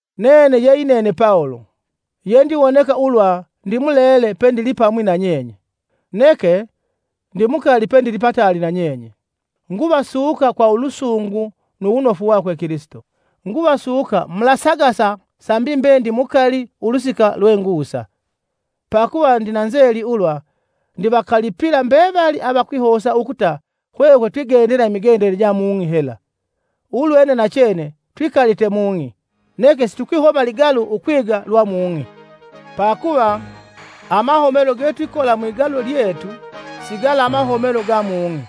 Nene ye yinene Pawulo, yendiwoneka ulwa ndimulele pendilipamwi nanyenye, neke ndimukali pendilipataali nanyenye, nguvasuka kwa ulusungu nu wunofu wakwe Kilisito. Nguvasuka mulasagasa sambi mbe ndimukali ulusika lwe ngusa, pakuva ndina nzeli ulwa ndivakalipila mbevali avakwihosa ukuta hwehwe twigendela imigendele ja mung'i hela. Ulwene nachene twikalite mung'i neke situkwihoma ligalu ukwiga lwa mung'i. Pakuva, amahomelo getwikola mwigalu lyetu, si gala amahomelo ga mung'i,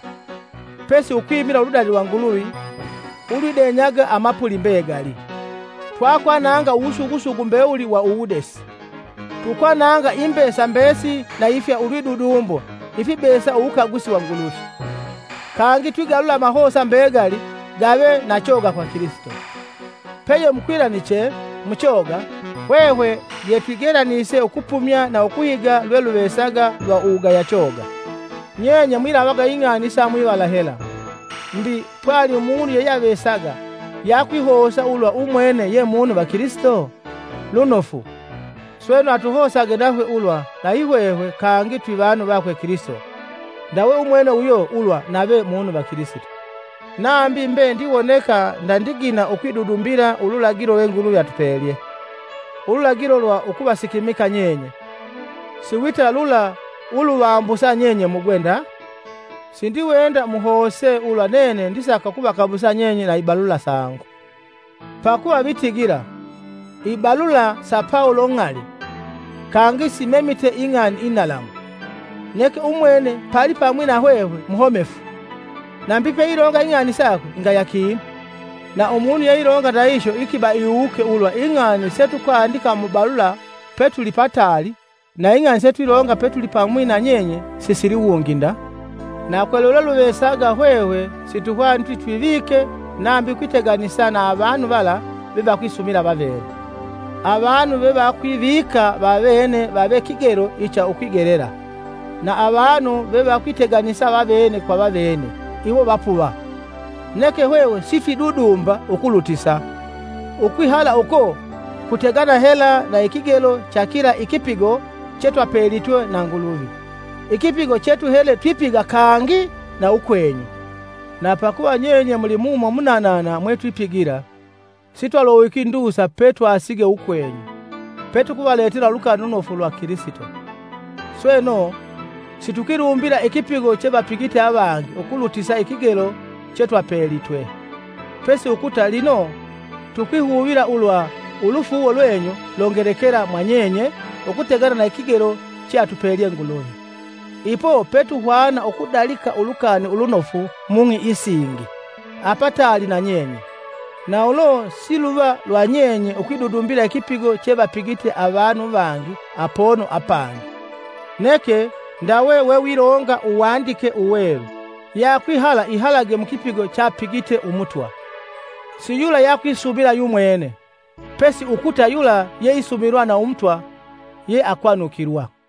pesi ukwimila uludali lwa Nguluvi ulwidenyaga amapuli mbegali. Twakwananga uwusugusugu mbewuli wa uwudesi, tukwananga imbesa mbesili na ifya ulwidudumbo ifibesa uwukagusi wa Nguluvi; kangi twigalula amahosa mbegali gave na choga kwa Kilisito. Peye mukwilaniche muchoga, hwehwe yetwigelanise ukupumya na ukuhiga lweluvesaga lwa uwugaya choga. Nyenye mwilavaga ing'ani isa mwivala hela. Mbi, pwali umunu yeyeavesaga yakwihosa ulwa umwene ye munu va Kilisito? Lunofu! Sweno, atuhosage nahwe ulwa nayi hwehwe kangi twi vanu vakwe Kilisito ndawe umwene uyo lwa nave munu va Kilisito. Nambi mbe ndiwoneka ndandigina ukwidudumbila ululagilo lwe Nguluvi atupelye, ululagilo lwa ukuvasikimika nyenye, siwita lula uluvambusa nyenye mugwe nda. Sindiwenda muhose ulwa nene ndisaka ukuvakabusa nyenye kwa ibalula sangu. Pakuva vitigila ukutigila, “Ibalula sa Pawulo ng'ali kangi simemite ing'ani inalamu, neke umwene palipamwi na hwehwe muhomefu, nambi peilonga ing'ani sakwe ngaya kinu.” Na umunu yeilonga ndahihyo ikiba iwuke ulwa ing'ani setukwandika mu balula petuli pataali, na ing'ani setwilonga petuli pamwi na nyenye sisiliwungi nda. Na kwa lwelweluvesaga hwehwe situhwaniti twivike nambi ukwiteganisa na avanu vala vevakwisumila vavene. Avanu vevakwivika vavene vave kigelo icha ukwigelela, na avanu vevakwiteganisa vavene kwa vavene, iwo vapuva. Neke hwehwe sitwidudumba ukulutisa; ukwihala uko kutegana hela na ikigelo cha kila ikipigo chetwapelitwe na Nguluvi, ikipigo chetuhele twipiga kangi na ukwenyu. Na pakuva nyenye muli mumo munanana mwetupigila, sitwalowiki ndusa petwasige ukwenyu, petukuvaletela Ulukani Ulunofu lwa Kilisito. Sweno, situkwilumbila ikipigo chevapigite avangi ukulutisa ikigelo chetwapelitwe; pesi ukuta lino tukwihuvila ulwa ulufuuwo lwenyu longelekela mwa nyenye ukutegana na ikigelo cheatupelye Nguluvi. Ipo petuhwana ukudalika Ulukani Ulunofu mung'i isingi, apataali na nyenye; na ulo si luva lwa nyenye ukwidudumbila ikipigo chevapigite avanu vangi apono apangi. Neke ndawe wewilonga Uwandike Uwelu, “Yeakwihala ihalage mukipigo chapigite Umutwa.” Si yula yeakwisumila yumwene, pesi ukuta yula yeisumilwa na Umutwa yeakwanukilwa.